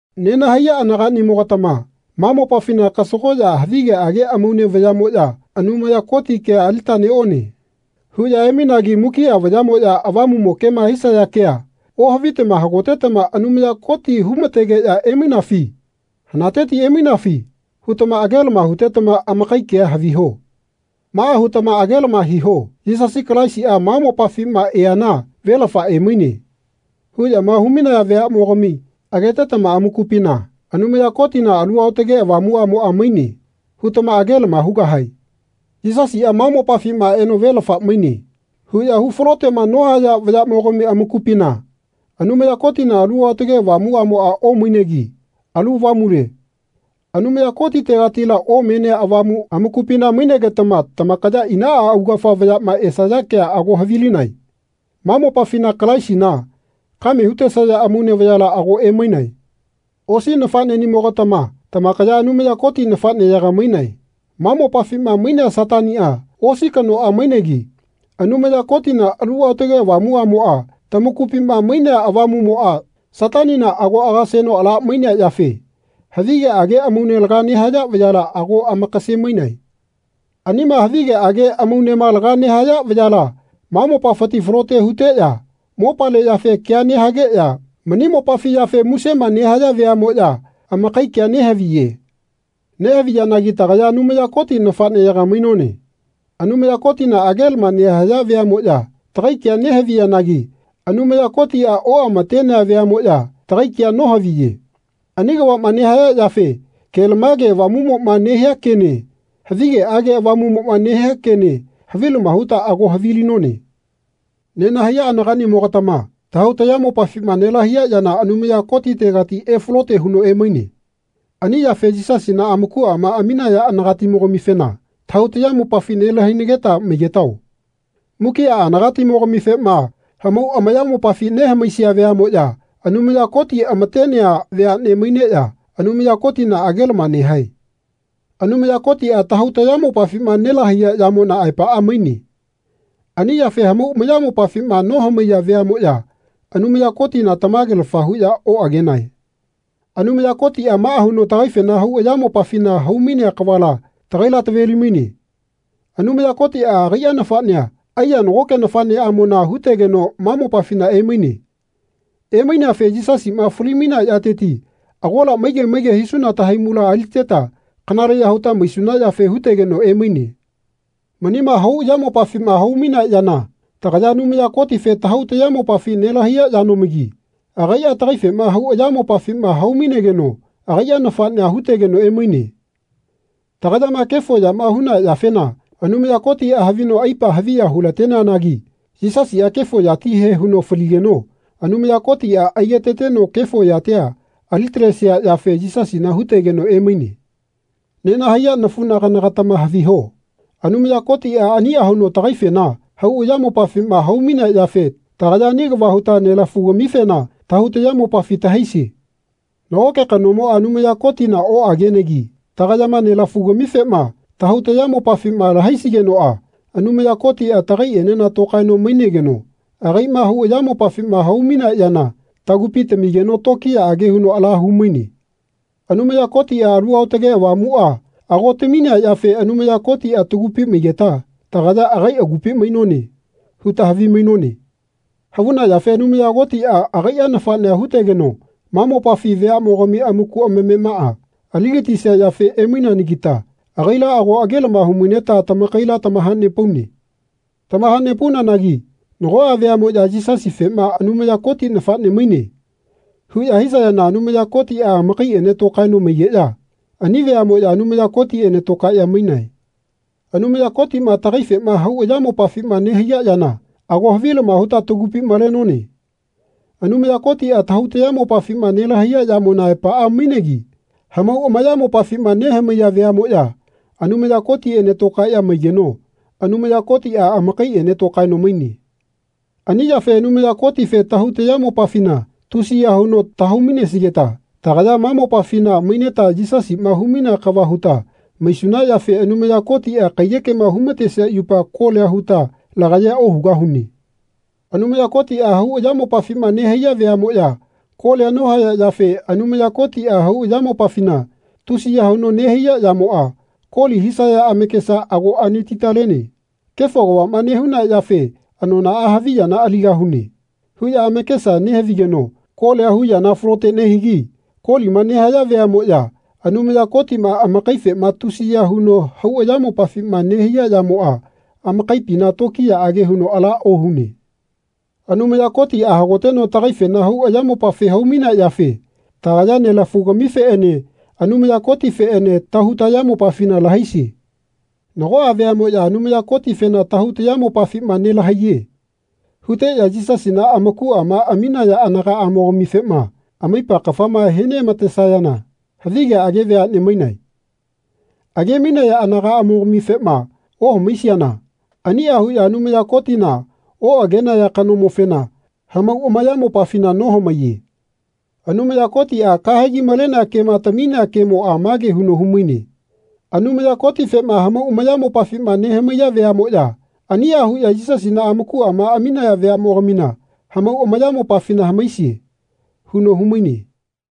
Nenahaiya anaganimogatama ma mopafina kasagoya havigeage amaune vayamoya Anumaya Koti kea alita neone. huya emainagi mukia vayamoya avamumo kema hisaya kea ohavitama hagotetama Anumaya Koti humategeya emainafi? Hanateti emainafi hutama agelama hutetama amakai kea haviho. Maa hutama agelama hiho Yisasi Kalaisia ma mopafima eana velafa emaine. huyama humainaya veamogami agetetama Amakupina Anumaya Kotina Alu Aotake Avamuamoa maine. hutama agelama hugahae. Yisasia ma mopafima eno velafa maine. huya hu falotema nohaya vayamogami amakupina Anumaya Kotina Alu Aotage Avamuamoa omainegi alu avamule Anumaya Kotitegatila omenea avamu amakupina mainegetama tamakaya inaa augafa vayama esaya kea ago havilinae. Ma mopafina Kalaisina kame hutesaya amaune vayala ago emainae. Osi nafanenimogatama tamakaya Anumaya Koti nafaneyaga mainae. Ma mopafima mainea Satania osi kanoa mainegi Anumaya Kotina Alu Aotage Avamuamoa tamakupima mainea Avamumoa Satanina ago agaseno ala mainea yafe havigeage amaune laga nehaya vayala ago amakase-mainae. Anima havigeage amaunema laga nehaya vayala ma mopafiti falote huteya mopale yafe kea nehageya mani mopafi yafe musema nehaya veamoya amakai kea nehaviye. Nehaviyanagi tagaya Anumaya Koti nafaneyaga mainone. Anumaya Kotina agelama nehaya veamoya tagai kea nehaviyanagi Anumaya Kotia oamatenea veamoya tagai kea nohaviye. Ani kavama nehaya yafe ke-lamage Avamumoma nehia kene havigeage avamumoma nehia kene havilama huta ago havilinone. Nenahaiya anaganimo-gatama tahau tayamopafima nelahaiya yana Anumaya Kotitegati efalote huno emaine. Ani yafe Yisasina amakuama aminaya anagatimo-gamifena tahau tayamopafi nelai-hainageta maigetao. Mukia anagatimo-gamifema hamau amayamopafi nehamaisia veamoya Anumaya Koti amatenea veane maineya Anumaya Kotina agelama nehae. Anumaya Kotia tahau tayamopafima nelahaiya yamona aepaa maine. Ani yafe hamau amayamopafima nohamaiya veamoya Anumaya Kotina tamagelafa huya oagenae. Anumaya Kotia maa huno tagaifena hau ayamopafina hau-mainea kavala tagaila taveli-maine. Anumaya Kotia agaia nafanea aiya nagoke nafaneamona hutegeno ma mopafina emaine. Emaineafe Yisasima fali-mainea yateti agola maige maige hisuna tahaimula aliteta kanaleya huta maisuna yafe hutegeno emaine. Manima hau ayamopafima hau-mainea yana tagaya Anumaya Kotife tahau tayamopafi nelahaiya yanomagi agaia tagaifema hau ayamopafima hau-mainegeno agaia nafanea hutegeno emaine. Tagayama kefo yama huna yafena Anumaya Kotia havino aipa haviya hu-lateneanagi Yisasia kefo yatihe huno faligeno Anumaya Kotia aigetateno kefo yatia alitalesia yafe Yisasina hutegeno emaine. Nenahaiya nafunagana-gatama haviho Anumaya Kotia ania huno tagaifena hau ayamopafima hau-mainea yafe tagaya ani kava huta nelafu-gamifena tahau tayamopafi tahaisie. Nagoke kanomoa Anumaya Kotina oagenegi tagayama nelafu-gamifema tahau tayamopafima lahaisigenoa Anumaya Kotia tagaienena tokaeno mainegeno agaima hau ayamopafima hau-mainea yana tagupi tamigeno tokiyaage huno ala hu-maine. Anumaya Kotia Alu Aotage Avamua ago taminea yafe Anumaya Kotia tagupi maigeta tagaya agai agupi mainone. huta havimainone. Havuna yafe Anumaya Kotia agaia nafanea hutegeno ma mopafi veamogami amaku amamemaa aligatisia yafe emaineanagita agaila ago agelama humaineta tamakaila tamahanepaune. Tamahanepaunanagi nagoa veamoya Yisasifema Anumaya Koti nafane maine. huya hisayana Anumaya Kotia amakaiene tokaeno maigeya ani veamoya Anumaya Kotiene tokaeya mainae. Anumaya Kotima tagaifema hau ayamopafima nehaiya yana ago havilama huta tagupi malenone. Anumaya Kotia tahau tayamopafima nelahaiya yamona aepaa mainegi hamau amayamopafima nehamaiya veamoya Anumaya Kotiene tokaeya maigeno Anumaya Kotia amakaiene tokaeno maine. Ani yafe Anumaya Kotife tahau tayamopafina tusiya huno tahau-mainesigeta tagaya ma mopafina maineta Yisasima hu-mainea kava huta maisuna yafe Anumaya Kotia kaiyekema humatesia yupa kolia huta lagayea ohugahune. Anumaya Kotia hau ayamopafima nehaiya veamoya kolia nohaya yafe Anumaya Kotia hau ayamopafina tusiya huno nehaiya yamoa koli hisaya amakesa ago anati-talene. Kefo kavama nehuna yafe anonaa havi yana aligahune. huya amakesa nehavigeno kolia hu yana falote nehigi kolima nehaya veamoya Anumaya Kotima amakaifema tusiya huno hau ayamopafima nehaiya yamoa amakaipina tokiyaage huno ala ohune. Anumaya Kotia hagoteno tagaifena hau ayamopafi hau-mainea yafe tagaya nelafu-gamifeene Anumaya Kotifeene tahau tayamopafina lahaisie. Nagoa veamoya Anumaya Kotifena Tahau tayamopafima nelahaiye. huteya Yisasina amakuama aminaya aganaamo-gamifema amaipa kafama he neamatesayana havigeage veane mainae. Age-mainaya anagaamo-gamifema ohamaisiana ania huya Anumaya Kotina, oagenaya kanomofena, hamau amayamopafina nohamaiye. Anumaya Kotia kahegi malenea kema taminea kemoa mage huno humaine Anumaya Kotifema hamau amayamopafima nehamaiya veamoya ania huya Yisasina amakuama aminaya veamogamina hamau amayamopafina hamaisie. huno humaine.